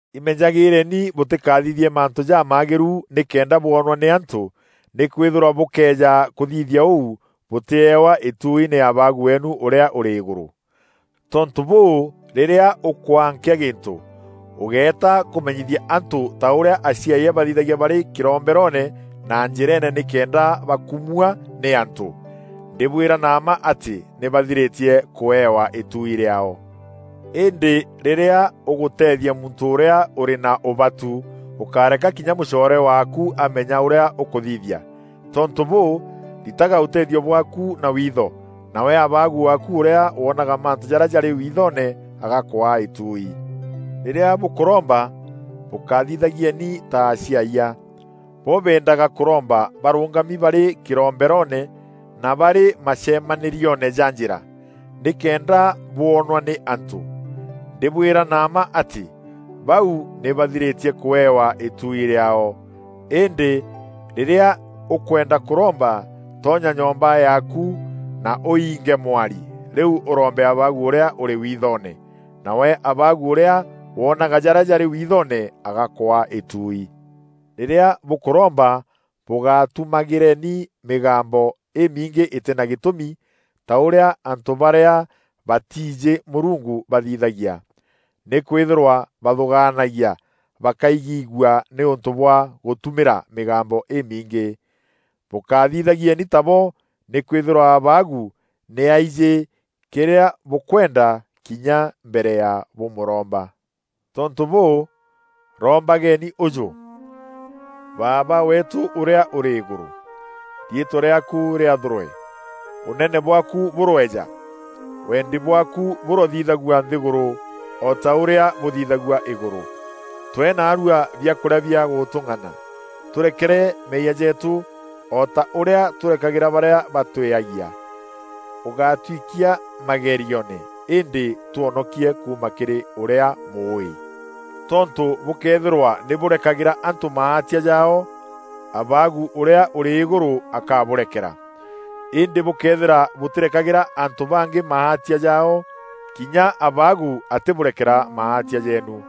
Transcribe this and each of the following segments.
“Imenyagîîreni bûtîkathithie mantû jamaagîru nîkenda bwonwa nî antû. Nîkwîthîrwa bûkëeja kûthithia ûu, bûtîewa îtuui nî Abaagu weenu ûrîa ûrî îgûrû. Tontû bûû, rîrîa ûkwaa nkîa gîntû, ûgeieta kûmenyithia antû ta ûrîa aciayia bathithagia barî kîromberoone na njîreene nîkenda bakumwaa nî antû. Ndîbwîra na mma atî nî bathirîtie kuewa îtuui rîaao. Îndî rîrîa ûgûteethia muntû ûrîa ûrî na ûbatu, ûkáreka kinya mûcoore waaku amenya ûrîa ûkûthithia. Tontû bûû, ritaga ûteethio bwaaku na witho, nawe Abaagu waaku ûrîa woonaga mantû jarîa jarî withoone agakwaa îtuui.” “Rîrîa bûkûromba, bûkathithagieni ta aciayia. Bo beendaga kûromba barûngami barî kîromberoone, na barî macemanîrioone ja njîra, nîkenda bwonwa nî antû. Ndîbwîra na mma atî, bau nî bathirîtie kûewa îtuui rîaao. Îndî rîrîa ûkwenda kûromba, tonya nyomba yaaku, na ûiinge mwari, rîu ûrombe Abaagu ûrîa ûrî withoone. Nawe Abaagu ûrîa woonaga jarîa jarî withoone agakwaa îtuui. Rîrîa bûkûromba bûgátumagîreni mîgambo îmingî îtîna gîtûmî ta ûrîa antû barîa batiijî Mûrungu bathithaagia. Nîkwîthîrwa bathûgaanagia bakaigîîgua nîûntû bwa gûtumîra mîgambo îmingî. Bûkathithagieni tabo nîkwîthîrwa Abaagu nî aijî kîrîa bûkwenda, kinya mbere ya bûmûromba. Tontû bûû, rombageni ûjû: ‘Baaba weetû ûrîa ûrî îgûrû: Riîtwa rîaakû rîathûrwe, ûnene bwaaku bûroeja, wendi bwaaku bûrothithagua nthîgûrû, o ta ûrîa bûthithagua îgûrû. Twee naarua biakûrîa bia gûtûng'ana. Tûrekere meeyia jeetû, o ta ûrîa tûrekagîra barîa batwîagia. Ûgatwikia magerioone, îndî twonokie kuuma kîrî ûrîa Mûûî.’ “Tontû bûkëethîra nî bûrekagîra antû maatia jaao, Abaagu ûrîa ûrî îgûrû akabûrekera. Îndî bûkëethîra bûtîrekagîra antû bangî maatia jaao, kinya Abaagu atîbûrekera maatia jeenu.”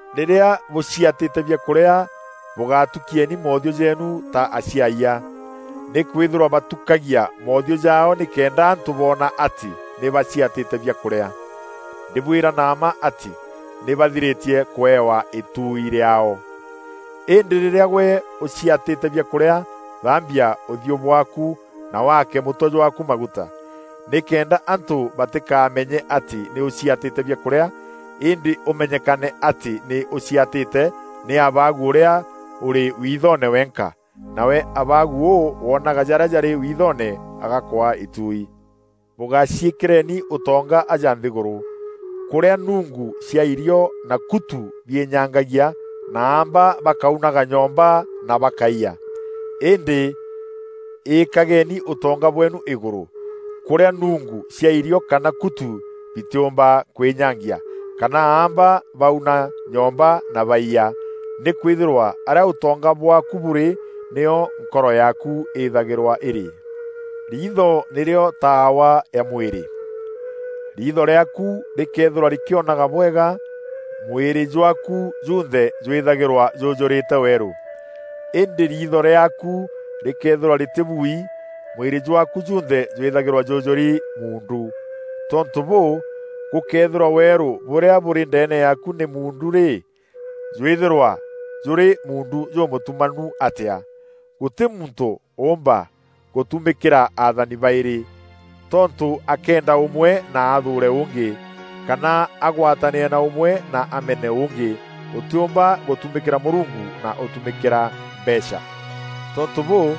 “Rîrîa bûciatîte biakûrîa bûgatukieni moothiû jeenu ta aciayia. Nîkwîthîrwa batukagia moothiû jaao nîkenda antû boona atî nî baciatîte biakûrîa. Ndîbwîra na mma atî nî bathirîtie kûewa îtuui rîaao. Îndî rîrîa gwe ûciatîte biakûrîa, thaambia ûthiû bwaaku na waake mûtwe jwaaku maguta, nîkenda antû batîkameenye atî nî ûciatîte biakûrîa îndî ûmenyekane atî nî ûciatîte nî Abaagu ûrîa ûrî withoone wenka. Nawe Abaagu ûu wonaga jarîa jarî withoone agakwaa îtuui.” “Bûgaciîkîreeni ûtonga aja nthîgûrû, kûrîa nungu cia irîo na kutu biînyangagia, na aamba bakaunaga nyomba na bakaiya. Îndî îîkageeni ûtonga bweenu îgûrû, kûrîa nuungu cia irîo kana kutu bitîîûmba kwînyangia kana aamba bauna nyomba na baiya. Nîkwîthîrwa arîa ûtonga bwaaku bûrî, nîo nkoro yaaku îthagîrwa îrî.” “Riitho nîrîo taawa ya mwîrî. Riitho rîaaku rîkëethîrwa rîkîonaga bwega, mwîrî jwaaku junthe jwîthagîrwa jûûjûrîte weerû. Îndî riitho rîaaku rîkëethîrwa rîtîbui, mwîrî jwaaku junthe jwîthagîrwa jûûjûri muundu. Tontû bûû, gûkëethîrwa weerû bûrîa bûrî ndeene yaaku nî muundu rî, jwîthîrwa jûrî muundu jûmûtumanu atîa!” “Gûtî muntû ûûmba gûtumîkîra athani baîrî. Tontû akeenda ûmwe na athûûre ûngî; kana agwatanîre na ûmwe na amene ûngî. Ûtîûmba gûtumîkîra Mûrungu na ûtumîkîra mbeecha.” “Tontû bûû,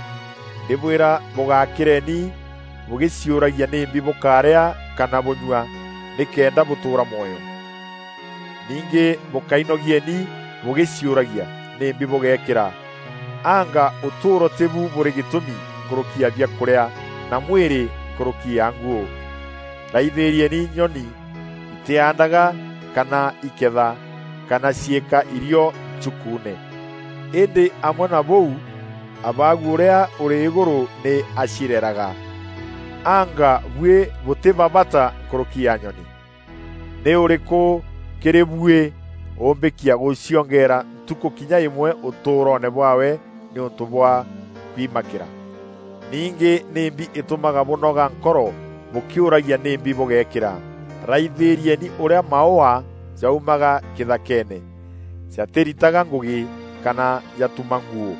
ndîbwîra bûgakîreni bûgîciûragia nîmbi bûkaarîa kana bûnyua nîkenda bûtûûra mwoyo. Ningî bûkainogieni bûgîciûragia nîmbi bûgeekîra. Anga ûtûûro tîbu bûrî gîtûmi nkûrûki ya biakûrîa, na mwîrî nkûrûki ya nguû? Raithîrieni nyoni, itîandaga kana iketha kana ciîka irîo nchukuune. Îndî amwe na bûu Abaagu ûrîa ûrî îgûrû nî acireraga. Anga buî bûtî ba bata nkûrûki ya nyoni? Nî ûrîkû kîrî buî ûûmbîkia gûciongeera ntukû kinya îmwe ûtûûroone bwaawe nîûntû bwa kwimakîra? Ningî nîmbi îtûmaga bûnoga nkoro bûkîûragia nîmbi bûgeekîra? Raithîrieni ûrîa maûa jaumaga kîthakeene! Jatîritaga ngûgî, kana jatuma nguû.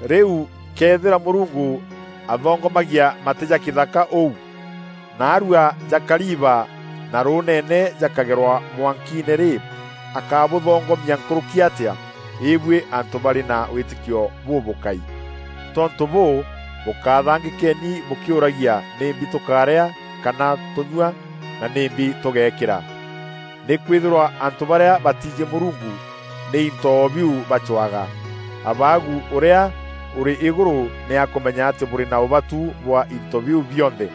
Rîu këethîra Mûrungu athongomagia matî ja kîthaka ûu, naarua jakariiba na rûûnene jakagerwa mwankiine rî, akabûthongomia nkûrûki atîa? Îbûî antû barî na wîtîkio bûbûkai! Tontû bûû, bûkathangîkeni bûkîûragia, ‘Nîmbi tûkaarîa, kana tûûnyua, na nîmbi tûgeekîra?’ Nîkwîthîrwa antû barîa batiijî Mûrungu nî into o biu bacwaga. Abaagu ûrîa ûrî îgûrû nî akûmenya atî bûrî na ûbatu bwa into biu bionthe.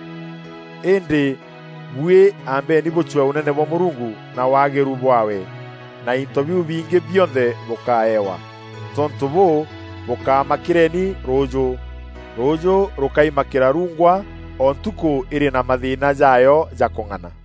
Îndî buî ambeni bûcwee ûnene bwa Mûrungu na waagîru bwaawe, na into biu bingî bionthe bûkaewa. Tontû bûû, bûkamakîreni rûûjû. Rûûjû rûkaimakîra ruungwa. O ntukû îrî na mathîîna jaayo ja kûng'ana.”